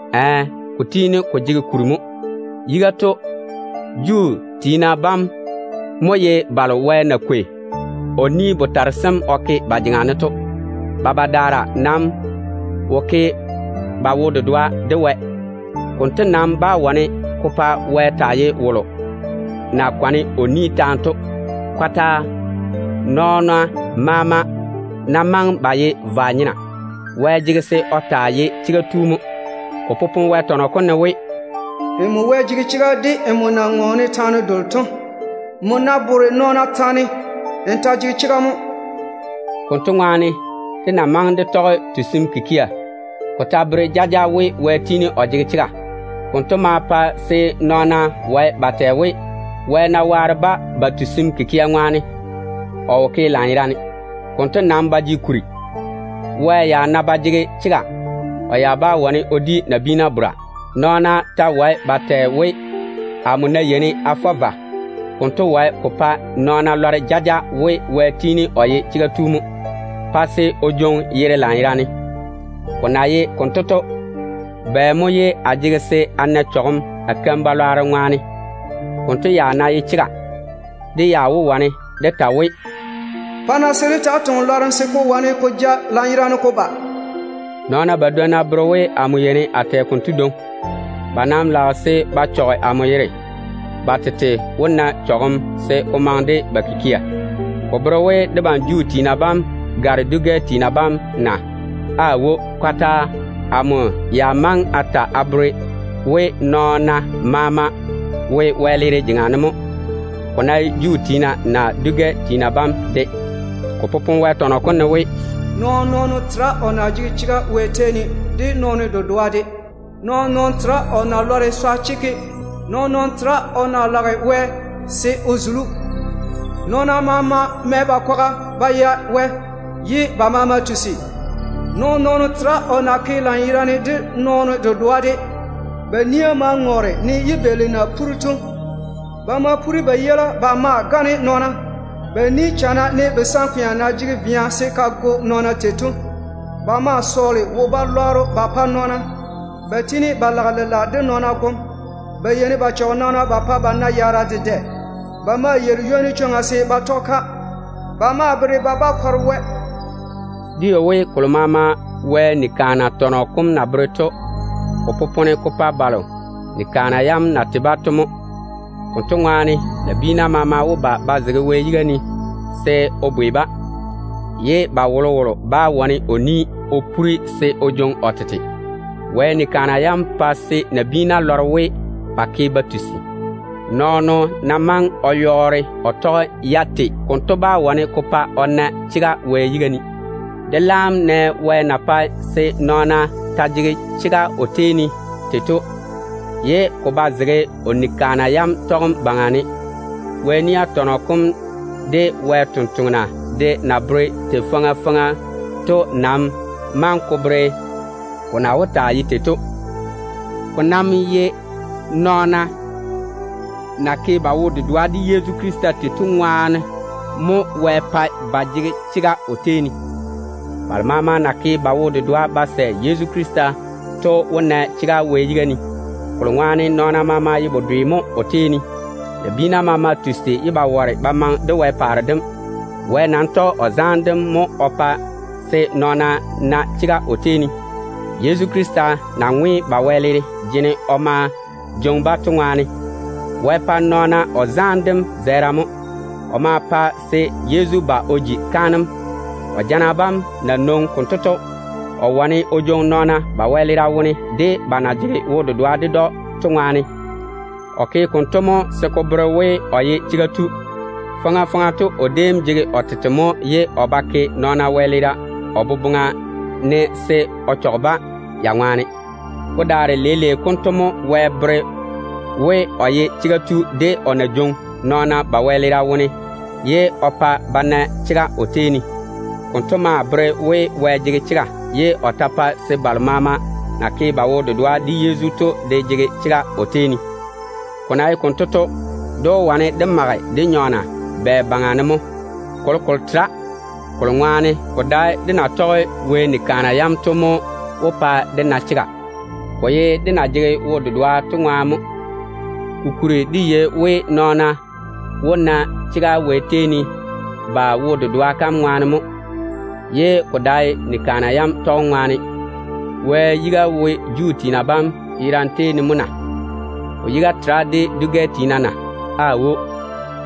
Ɛɛ, ko tiini ko jege kuri. Yiga to, Juu tiina bam mo ye balo Wɛ na kwei o ni-botare sem o ke ba jeŋa ne to. Ba badaara nam wo ke ba wo-dedoa de Wɛ. Konto nam bá wane ko pa Wɛ taa ye wolo na nwoŋi o chega kam kwaga ne to. Kɔtaa. Nɔɔna maama ná maŋe ba ye vwa-nyena, Wɛ jege se o ta taa ye chega tu mo. Ko popone Wɛ tɔnɔ kom ne we: “Nmo jege chega de nmo na ŋɔɔne taane delo to. Nmo ná bore nɔɔna taane, n ta jege chega mo.” Konto ŋwaane, dé ná maŋe dé tɔge tusim kikia, ko ta bere jaja we Wɛ tiini o jege chega. Konto maa pae se nɔɔna wae ba tɛ we, Wɛ ná waare-ba ba tusim kikia ŋwaane, o wo ke lanyerane. Konto nam ba jege kuri. Wɛ ya ná ba jege chega, o ya bá wane o di nabiina bora. Nɔɔna ta wae ba tɛ we, “Amo ná yeini a fɔ vwa, konto wae ko pa nɔɔna lɔre jaja we Wɛ tiini o ye chega tu mo, pa se o jwoŋi yere lanyerane. Ko na ye konto to, bɛ mo ye a jege se a na chɔgem a keim-balwaaro ŋwaane?” Konto ya ná ye chega, dé ya wó wane dé ta we, “Pa-na se dé taa toŋe lwarem, se ko wane ko ja lanyerane ko ba.” Nɔɔna badwonna bere we amo yeini a tɛ konto dwoŋi. Ba nam lage se ba chɔge amo yere mo. Ba tete wó na chɔgem se ko maŋe de ba kikia. Wɔ mo jege chega Wɛ yiga ne? Ko bere we debam Juu tiina bam gare dwi-gɛ tiina bam na? Aawo, kɔtaa. Amo ya maŋe a ta jaja we nɔɔna maama wo wɛleera jeŋa ne mo, ko ná ye Juu tiina naa dwi-gɛ tiina bam de. Ko popone Wɛ tɔnɔ kom ne we: “Nɔɔn-nɔɔno tera o na jege chega Wɛ tei ne, de nɔɔno dedoa de. Nɔɔn-nɔɔno tera o na lɔre swa chekke. Nɔɔn-nɔɔno tera o na lage Wɛ se o zuli‑o. Nɔɔna maama mɛ ba kwaga ba ya Wɛ, ye ba maama tusi. Nɔɔn-nɔɔno tera o na ke lanyerane, de nɔɔno dedoa de. Ba nia maa ŋɔɔre, ne yibeeli na puri to. Ba maa mae ba dindeilima ba gane nɔɔna. Ba ni taane goe nɔɔna, ne kapaa vea na ke tei to. Ba maa sɔɔle wo-balwaaro ba pa nɔɔna. Ba tiini ba lage lela de nɔɔna gom. Ba yeini ba chɔge nɔɔna pa ba na yaara dedɛ. Ba maa yeiri ywoni chwoŋa se ba tɔge-ka. Ba maa bere ba ba kɔre Wɛ.” Dé yei we kolo maama Wɛ nia tɔnɔ kom na bere to, ko popone ko pa balo ni-kaana yam na tei-ba to mo. Konto ŋwaane, nabiina maama wó ba ba zege Wɛ yiga ne se o bwei-ba, ye ba wolowolo bá wane o pore o ni se o jwoŋi o tete. Wɛ ni-kaana yam pae se nabiina lɔre we ba ke ba tusi. Nɔɔno ná maŋe o yɔɔre o tɔge-ya tei, konto bá wane ko pa o na chega Wɛ yiga ne. Leile konto dé laam lɔre Wɛ na tɔge chwoŋa kalo o pae se nɔɔna jege chega o tei ne to, ye ko ba zege o nia yam tɔgem baŋa ne. Moses de Wɛ sampwori sem de na bere tei faŋa faŋa to nam maŋe ko bere ko na wó taa ye tei to. Ko nam ye nɔɔna na ke ba wo-dedoa de Yezu Krista tei to ŋwaane mo Wɛ pae ba jege chega o tei ne. Balo maama na ke ba wo-dedoa ba sɛ Yezu Krista to wó na chega Wɛ yiga ne, kolo ŋwaane nɔɔna maama ye bedwe mo o tei ne. Nabiina maama tusi ye ba ware ba maŋe de Wɛ paare dem. Wɛ nam tɔge o zaane dem baŋa ne mo o pae se nɔɔna na chega o tei ne, Yezu Krista na ŋwe ba wɛleera jene o ma jwoŋi-ba to ŋwaane. Wɛ pae nɔɔna o zaane dem zɛɛra mo. O ma pa se Yezu ba o ji kaanem. O jana bam na nwoŋi konto to, o wane o saare nɔɔna wɛleera Wɛ yiga ne, ba na jege wo-dedoa ded‑o to ŋwaane. Wɛ ke konto mo se ko bere we o ye chega tu. Faŋa faŋa to o déem jege o tete mo ye o ba ke nɔɔna wɛleera o boboŋa ne se o chɔge-ba ya ŋwaane. Ko daare leile konto mo Wɛ bere we o ye chega tu de o na jwoŋi nɔɔna ba wɛleera wone ye o pa ba na chega o tei ne to. Konto maa bere we Wɛ jege chega ye o ta pae se balo maama na ke ba wo-dedoa de Yezu to de jege chega o tei ne. Ko na ye konto to, dé wó wane dé mage dé nyɔɔna bɛ baŋa ne mo? Kolokolo tera. Kolo ŋwaane ko dae dé na tɔge Wɛ ni-kaana yam to mo wó pa dé na chega. Ko nam ye dé na jege wo-dedoa to ŋwaane mo. Kokuri dé yei we nɔɔna wó na chega Wɛ tei ne ba wo-dedoa kam ŋwaane mo, ye ko dae ni-kaana yam tɔgem ŋwaane. Wɛ yiga wo Juu tiina bam yerane wone mo na? O yiga tera de dwi-gɛ tiina na? Aawo.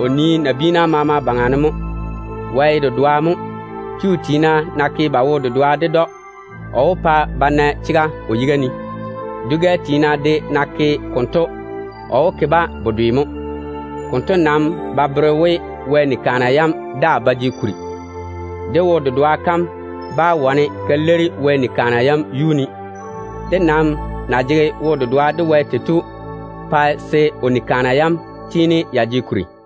O nii nabiina maama baŋa ne mo. Wɛ ye dedoa mo. Juu tiina ná ke ba wo-dedoa ded‑o, o wó pa ba na chega o yiga ne. Dwi-gɛ tiina de ná ke konto, o wó ke-ba bedwe mo. Konto nam ba bere we Wɛ ni-kaana yam daa ba jege kuri. Dé wo-dedoa kam bá wane ka leiri Wɛ ni-kaana yam yuu ne. Dé nam na jege wo-dedoa de Wɛ tei to pae se o nia yam tiini ya jege kuri mo.